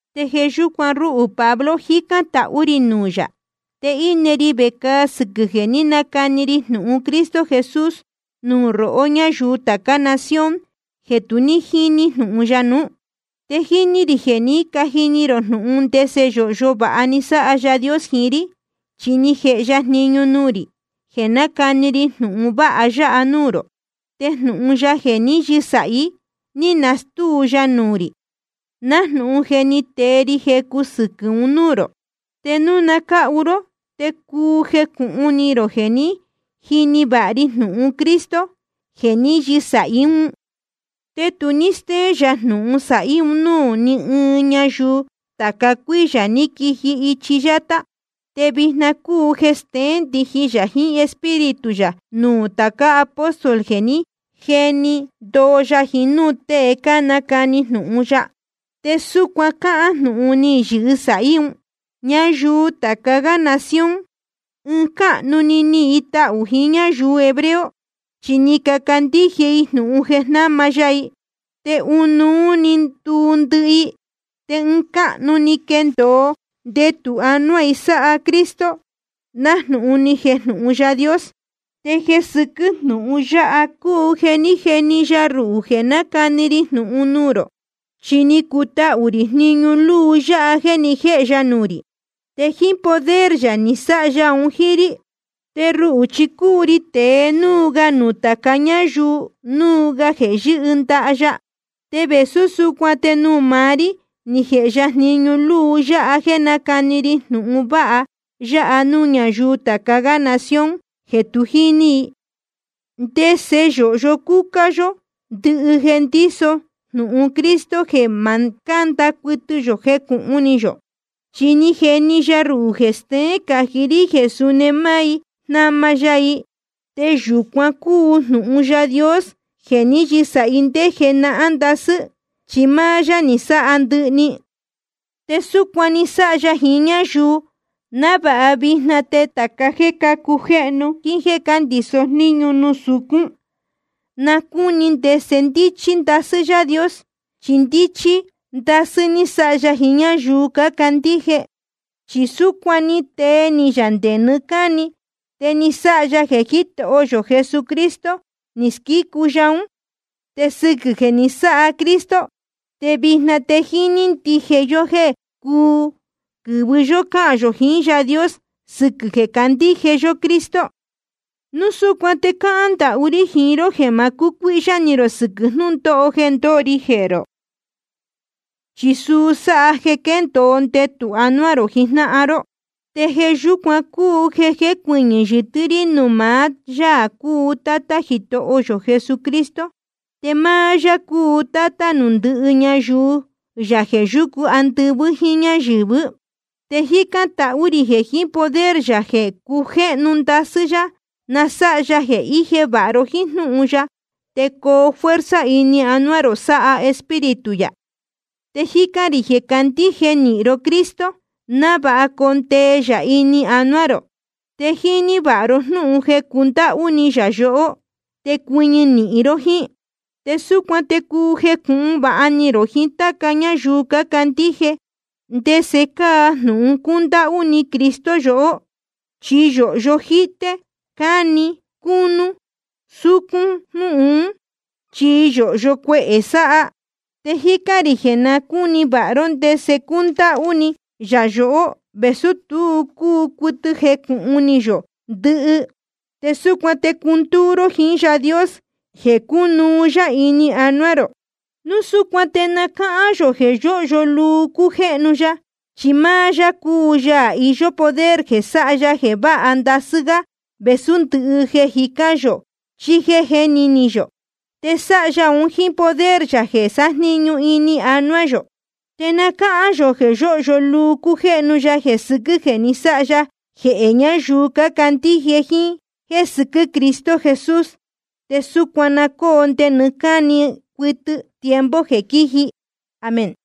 Te jeē yúcuan ruhū Pablo, jícán tahú rī nuū yā. Te íne ri vecāa sɨquɨ̄ jeē ní nacani ri jnūhun Cristo Jesús nuū rohó ñáyuu tācá nación jeē tu ní jíní jnūhun ya nuú. Te jíní rī jeē ní cajini ró jnúhun ndese yōhyo vāha ni sáha Yaā Dios jiín rí, chi ni jēhe ya jniñu nuū rī jeē nácani ri jnūhun vāha ya nuū rō. Te jnūhun ya jeē ní yɨsāhí, ni nastúu ya nuū rī, nájnūhun je ni tee ri jecu sɨquɨ̄ un núū rō. Te núu na cáhu ró te cuu jecūhun ni rō jeē ní jini vāha ri jnūhun Cristo jeē ní yɨsāhí un. Te tu ní stéén yā jnūhun sāhí un núū ní ɨɨn ñayuu tāca cuíyā ní quiji ichi yátá. Te vijna cúu jeē steén ndijin yā jiín Espíritu yā nuū tācá apóstol jeē ní jeni ndoo ya, jiín núū tée cánacani jnūhun ya. Te súcuan cáhán jnūhun ní yɨsāhí un: Ñayuu tāca gá nación, ɨɨn cáhnu‑ni nihīn i tahū i jíín ñáyuu hebreo, chi ni cacandíje i jnūhun jeē jnáma ya i. Te ɨnuú‑ni ni nduu ndɨhɨ i, te ɨɨn cáhnu‑ni quéndōo ndetū anuá i sáha Cristo, nájnūhun ni jejnūhun Yaā Dios. Te jeē sɨquɨ́ jnūhun yáha cúu jeē ní jeni ya ruhū jeē nácani ri jnūhun nuū rō. Chi ni cutahū rī jniñu luu yáha jeē ni jéhe ya nuū rī. Te jíín poder yā ni sáha ya un jíín rí. Te ruhū chi cúu ri tēe núu ga nuū tāca ñáyuu núu ga jeē yɨ́hɨ ndaha ya. Te vēsú súcuan te nuū maá rí ni jēhe ya jniñu luu yáha jéē nácani ri jnūhun vāha ya nuū ñáyuu tācá nación jeē tu jíní, ndese yōhyo cúcá yó ndɨhɨ jeē ndíso jnūhun Cristo, jeē ma cánda cuɨtɨ yō jecūhun ni yō. Chi ni jeni ya ruhū jeē steén cají rí jeē suni máá i jnama ya i. Te yūcuan cúu jnūhun Yaā Dios jeē ni yɨ́sāhi ndé jenahán ndasɨ́, chi máá yá ni sáha ndɨhɨ‑ni. Te súcuan ni sáha ya jiín ñáyuu, návāha vijna te tāca jéē cácujéhnu jíín jéē ndíso jníñu nuū sucún, na cúni ndese ndíchí ndasɨ́ Yaā Dios. Chi ndíchí ndasɨ́ ni sáha ya jiín ñáyuu cácandíje. Chi súcuan ni tee ni yā nde nɨɨ́ cáni, te ni sáha ya jeē Jítoho yō Cristo Jesús ni squícu ya ún. Te sɨquɨ̄ jeē ni sáha Cristo, te vijna te jíní ndije yó jéē cúu quɨ̄vɨ yó cáhān yō jiín Yaā Dios sɨquɨ̄ jeē candíje yó Cristo. Núu súcuan te cáhán ndahú rí jiín ró jeē ma cucuíhyá ni rō sɨquɨ̄ jnūndóho jeē ndóho ri jehē rō. Chi suu sáha jeē quéndōo ndetū anuá rō jijnáhan ró. Te jeē yúcuan cúu jeē jécuɨñɨ̄ yɨtɨ́ rí nuū maá Yaā cúu Tátá Jitoho yō Jesucristo. Te máá yá cúu Tátá nuū ndɨhɨ ñayuu yā jeē yúcu andɨvɨ́ jíín ñáyɨ̄vɨ́. Te jícán tahú rī jeē jiín poder yā jeē cujéhnu ndasɨ́ yá, na sáha ya jeē íje vāha ni rō jiín jnúhun ya, te coo fuerza ini anuá rō, sáha Espíritu yā. Te jícán rī jeē candíje nīhin ró Cristo, návāha condee yā ini anuá rō, te jnɨɨ vāha ró jnúhun jeē cundáhú ni yā rohó, te cuɨñɨ nīhin ró jíín. Te súcuan te cuu jecūhun vāha ni rō jiín táca ñáyuu candíje, ndese cáa jnūhun cúndáhú ni Cristo yohó. Chi yōhyo jíté, cáni, cúnú, súcún jnúhun ún, chi yōhyo cuehē sáha. Te jícán rī jeē na cúni vāha ró ndese cúndáhú ni yā yohó, vēsú tu cúu cuɨtɨ jecūhun ni yō ndɨhɨ ndɨhɨ. Te súcuan te cundúú ró jiín Yaā Dios jeē cunuú yá ini anuá rō. Núu súcuan te na cáhán yō jeē yóhyo luu cújéhnu ya, chi máá yá cúu Yaā iyó poder jeē sáha ya jeē váha ndasɨ́ gá vēsú ndɨhɨ jeē jicán yō chí jéē jéni ni yō. Te sáha ya un jíín poder yā jeē sájniñu ini anuá yō. Te na cáhán yō jeē yóhyo luu cújéhnu ya jeē sɨquɨ́ jeē ni sáha ya jehē ñayuu cácandíje jíín jéē sɨquɨ́ Cristo Jesús. Te súcuan na cóo nde nɨɨ́ cáni cuɨtɨ tiempo jeē quíji. Amén.